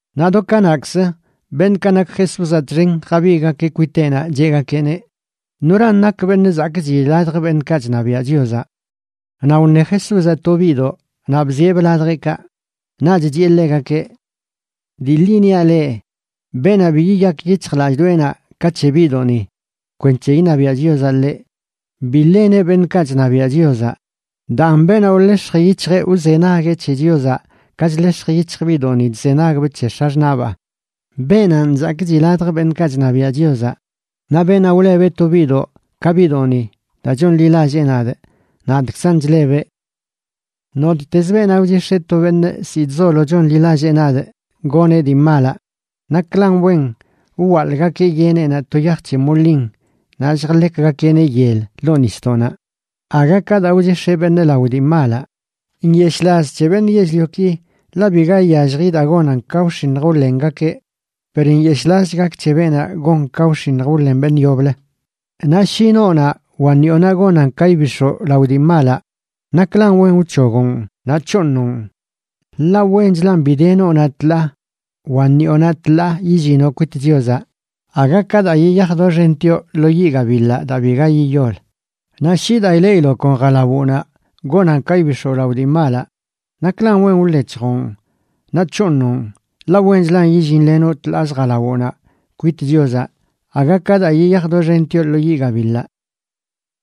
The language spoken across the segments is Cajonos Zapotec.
Naꞌ do kanaꞌkzə, beṉꞌkaꞌ nak Jesúzaꞌ txen jabigꞌgakeꞌ kwiteꞌnaꞌ cheꞌgakeꞌneꞌ: ―¿Noran nak beṉꞌ zakꞌchi ladj beṉꞌkaꞌ chṉabiaꞌ Chiozaꞌ? Naꞌ wṉe Jesúzaꞌ to biꞌdoꞌ naꞌ bzieꞌbꞌ ladjeꞌkaꞌ. Naꞌch chiꞌe ḻegakeꞌ: ―Dii ḻi niaꞌ leꞌ, beenaꞌ bi yiyak yic̱hjlallꞌdoꞌenaꞌ ka c̱he biꞌdoꞌni kwenc̱he iṉabiaꞌ Chiozaꞌ ḻeꞌ, bi ḻeneꞌ beṉꞌkaꞌ chṉabiaꞌ Chiozaꞌ. Daan beenaꞌ wḻex̱j yic̱hjeꞌ wzenagueꞌ c̱he Chiozaꞌ ka chḻex̱j yic̱hj biꞌdoꞌni chzenagbꞌ c̱he x̱axṉaꞌbaa, beenanꞌ zakꞌchi ladj beṉꞌkaꞌ chṉabiaꞌ Chiozaꞌ. Naꞌ beenaꞌ wlebeꞌ to biꞌdoꞌ ka biꞌdoꞌni daa chonḻilallee nadꞌ, nadꞌkzan chlebeꞌ. ’Nottez beenaꞌ wchix̱eꞌ to beṉꞌ ziꞌ chzolo chonḻilallee nadꞌ goneꞌ dii malaꞌ, naklan wen wwaḻꞌgakeꞌ yeneꞌnaꞌ to yaj c̱he molin naꞌ lljḻekgakeꞌneꞌ yel ḻoo nisdoꞌnaꞌ aga ka daa wchix̱eꞌ beṉꞌ lao dii malaꞌ. ¡Nyeshꞌlaz c̱he beṉꞌ yell-lioki!, ḻaꞌ biga iyallji daa gonan ka wx̱iṉj wḻengakeꞌ. Per ¡nyeshꞌlazch gak c̱he beenaꞌ gon ka wx̱iṉj wḻen beṉꞌ yoblə! ’Naꞌ shi noonaꞌ wa ṉiꞌonaꞌ gonan ka ibix̱oꞌ lao dii malaꞌ, naklan wen wc̱hogoꞌn naꞌ c̱hooṉoꞌn, ḻaꞌ wenchlan bi de noonaꞌ tḻaa wa ṉiꞌonaꞌ tḻaa yillinoꞌ kwit Chiozaꞌ aga ka daa yiyaj doxentioꞌ lo yiꞌ gabiḻaꞌ daa biga yiyol. Naꞌ shi daa ileꞌiloꞌ kon jalawoꞌnaꞌ gonan ka ibix̱oꞌ lao dii malaꞌ, naklan wen wḻec̱hjoꞌn naꞌ c̱hooṉoꞌn, ḻaꞌ wenchlan yillinlenoꞌ tḻaaz jalawoꞌnaꞌ kwit Chiozaꞌ aga ka daa yiyaj doxentioꞌ lo yiꞌ gabiḻaꞌ.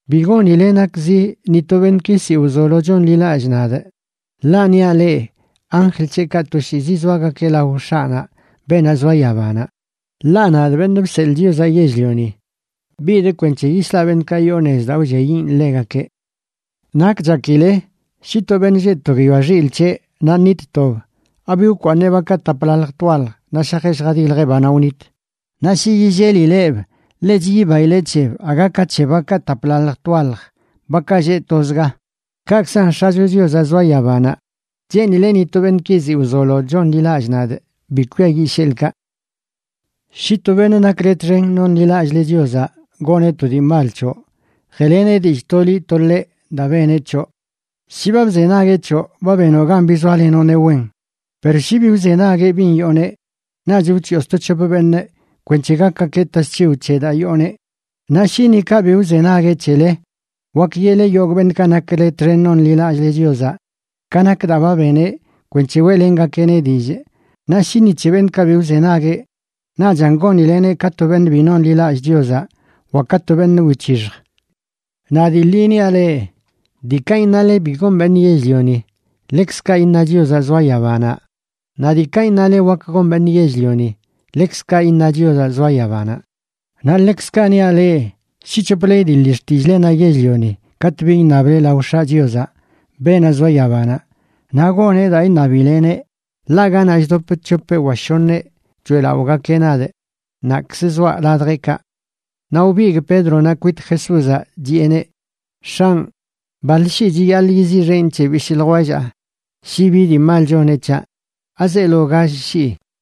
’Bi gonile nakzi ni to beṉꞌki ziꞌ wzolo chonḻilallꞌ nadꞌ. Ḻaꞌ niaꞌ leꞌ, anjl c̱heꞌkaꞌ toshiizi zoagakeꞌ lao X̱aꞌnaꞌ, beenaꞌ zoa yabanaꞌ. Ḻaꞌ nadꞌ, Beṉꞌ Bseḻꞌ Chiozaꞌ Yell-lioni, bidꞌ kwenc̱he yislaꞌ beṉꞌkaꞌ yoo nez daa wlliayiꞌn ḻegakeꞌ. ’¿Nak chakile? Shi to beṉꞌ lleꞌ to guiyoa xilꞌ c̱heꞌ naꞌ ṉit tob, ¿abi wkwaaṉeꞌ bakaꞌ taplaḻj twaḻj naꞌ shajeꞌ lljadiljeꞌ banaꞌ wnit? Naꞌ shi yillelileꞌb, ḻech yibaileꞌ c̱heb aga ka c̱he bakaꞌ taplaḻj twaḻj bakaꞌ lleꞌ tozga. Kaꞌkzan X̱acho Chiozaꞌ zoa yabanaꞌ cheenileꞌ ni to beṉꞌki ziꞌ wzolo chonḻilallꞌ nadꞌ bi kwiayiꞌ sheḻꞌkaꞌ. ’Shi to beṉꞌ nakle txen nonḻilallꞌle Chiozaꞌ goneꞌ to dii mal c̱hoꞌ, jeꞌleneꞌ dillꞌ to liꞌ to ḻeꞌ daa beneꞌ c̱hoꞌ. Shi ba bzenagueꞌ c̱hoꞌ, ba benoꞌ gan bizoalenoꞌneꞌ wen. Per shi bi wzenagueꞌ bin yooneꞌ, naꞌch wc̱hiꞌo sto c̱hop beṉꞌ kwenc̱he gakgakeꞌ tasc̱hiw c̱he daa yooneꞌ. Naꞌ shi ni kaꞌ bi wzenagueꞌ c̱hele, wak yeꞌle yogꞌ beṉꞌkaꞌ nakle txen nonḻilallꞌle Chiozaꞌ ka nak daa ba beneꞌ kwenc̱he weꞌlengakeꞌneꞌ dillꞌ. Naꞌ shi ni c̱he beṉꞌkaꞌ bi wzenagueꞌ, naꞌchan gonileneꞌ ka to beṉꞌ bi nonḻilallꞌ Chiozaꞌ wa ka to beṉꞌ wic̱hixj. ’Naꞌ dii ḻi niaꞌ leꞌ, diikaꞌ iṉale bi gon beṉꞌ yell-lioni, ḻekzkaꞌ iṉa Chiozaꞌ zoa yabanaꞌ, naꞌ diikaꞌ iṉale wak gon beṉꞌ yell-lioni, ḻekzkaꞌ iṉa Chiozaꞌ zoa yabanaꞌ. ’Naꞌ ḻekzkaꞌ niaꞌ leꞌ, shi c̱hople idiḻi xtillꞌlenaꞌ yell-lioni katꞌ bi iṉable lao X̱aꞌ Chiozaꞌ, beenaꞌ zoa yabanaꞌ, naꞌ goneꞌ daa iṉabileneꞌ. Ḻaꞌ ganaꞌ chdop c̱hopeꞌ wa shoṉeꞌ choeꞌlaꞌogakeꞌ nadꞌ, naꞌkz zoaꞌ ladjeꞌkaꞌ. Naꞌ wbigꞌ Pédronaꞌ kwit Jesúzaꞌ, chiꞌeneꞌ: ―X̱anꞌ, ¿baḻ shii chiyaḻꞌ yiziꞌxenꞌ c̱he bishꞌ ljwellaa shi bi dii mal choneꞌ c̱haꞌ? ¿Azeelo gall shii?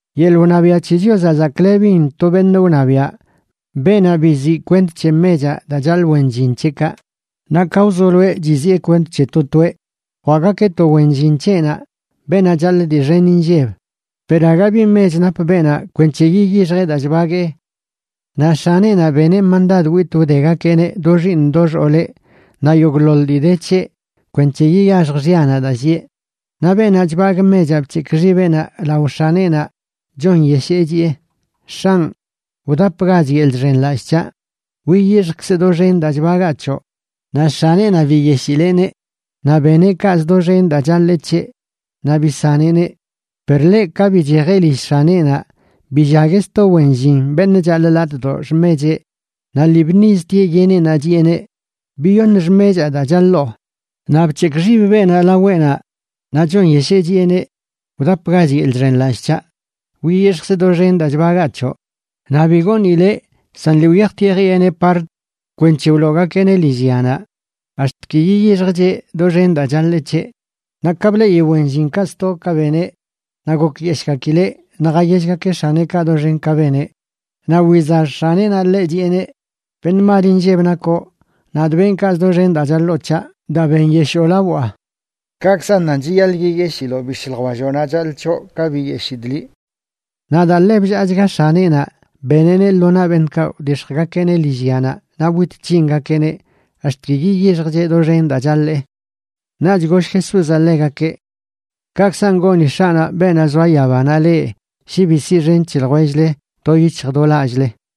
’Yeḻꞌ wṉabiaꞌ c̱he Chiozaꞌ zaklebin to beṉꞌ wṉabiaꞌ beenaꞌ biziꞌ kwent c̱he mechaꞌ daa chaḻꞌ wen llin c̱heꞌkaꞌ. Naꞌ ka wzoloeꞌ chiziꞌe kwent c̱he to toeꞌ, jwaꞌgakeꞌ to wen llin c̱heꞌnaꞌ beenaꞌ chaḻꞌ dii xen inlleb. Per aga bi mech nap beenaꞌ kwenc̱he yiyixjeꞌ daa chbaguee, naꞌ x̱aneꞌnaꞌ beneꞌ mandad witꞌ wdegakeꞌneꞌ do xiiṉ do xooleꞌ naꞌ yogꞌḻoḻ dii de c̱heꞌ kwenc̱he yiyaxj xyanaꞌ daa llieꞌ. Naꞌ beenaꞌ chbagꞌ mechaꞌ bc̱hekꞌ xibeꞌnaꞌ lao x̱aneꞌnaꞌ, chonyeshee, chiꞌe: “X̱anꞌ, wdapgach yeḻꞌ chxenlallꞌ c̱haꞌ, wiyixjkzꞌ doxen daa chbagaa c̱hoꞌ.” Naꞌ x̱aneꞌnaꞌ biyeshileꞌneꞌ, naꞌ beneꞌ kaꞌz doxen daa chaḻee c̱heꞌ, naꞌ bisaneꞌneꞌ. Per ḻeꞌ, ka bichejeꞌ lill x̱aneꞌnaꞌ, billagueꞌ sto wen llin beṉꞌ chaḻꞌ latꞌdoꞌ xmecheꞌ, naꞌ lii bṉiztieꞌ yeneꞌnaꞌ chiꞌeneꞌ: “¡Biyoṉ xmechaa daa chaḻoo!” Naꞌ bc̱hekꞌ xib beenaꞌ laweꞌnaꞌ naꞌ chonyeshee, chiꞌeneꞌ: “Wdapgach yeḻꞌ chxenlallꞌ c̱haꞌ, wiyixjkzꞌ doxen daa chbagaa c̱hoꞌ.” Naꞌ bi goonileꞌ, san lii wyajtieꞌ jiꞌeneꞌ part kwenc̱he wloogakeꞌneꞌ lillyanaꞌ ax̱t ki yiyixjcheꞌ doxen daa chaḻee c̱heꞌ. Naꞌ ka bleꞌi wen llinkaꞌ sto ka beneꞌ, naꞌ gokyeshꞌgakileꞌ naꞌ jayellgakeꞌ x̱aneꞌkaꞌ doxen ka beneꞌ. Naꞌ wizax x̱aneꞌnaꞌ ḻeꞌ, chiꞌeneꞌ: “Beṉꞌ mal inlleb nakoꞌ. Nadꞌ benꞌ kaꞌz doxen daa chaḻoo c̱haꞌ daa benyeshoo lawaꞌ. Kaꞌkzan nan chiyaḻꞌ yiyeshiloꞌ bishꞌ ljwelloꞌnaꞌ chaḻꞌ c̱hoꞌ, ka biyeshidꞌ liꞌ.” Naꞌ daa ḻe bllaachga x̱aneꞌnaꞌ, beneꞌneꞌ lo naꞌ beṉꞌkaꞌ wdix̱jgakeꞌneꞌ lillyanaꞌ naꞌ wit c̱hingakeꞌneꞌ ax̱t ki yiyixjcheꞌ doxen daa chaḻee. Naꞌch goll Jesúzaꞌ ḻegakeꞌ: ―Kaꞌkzan goni X̱aꞌnaꞌ beenaꞌ zoa yabanaꞌ leꞌ shi bi siꞌxen c̱he ljwell-le do yic̱hj do lallꞌle.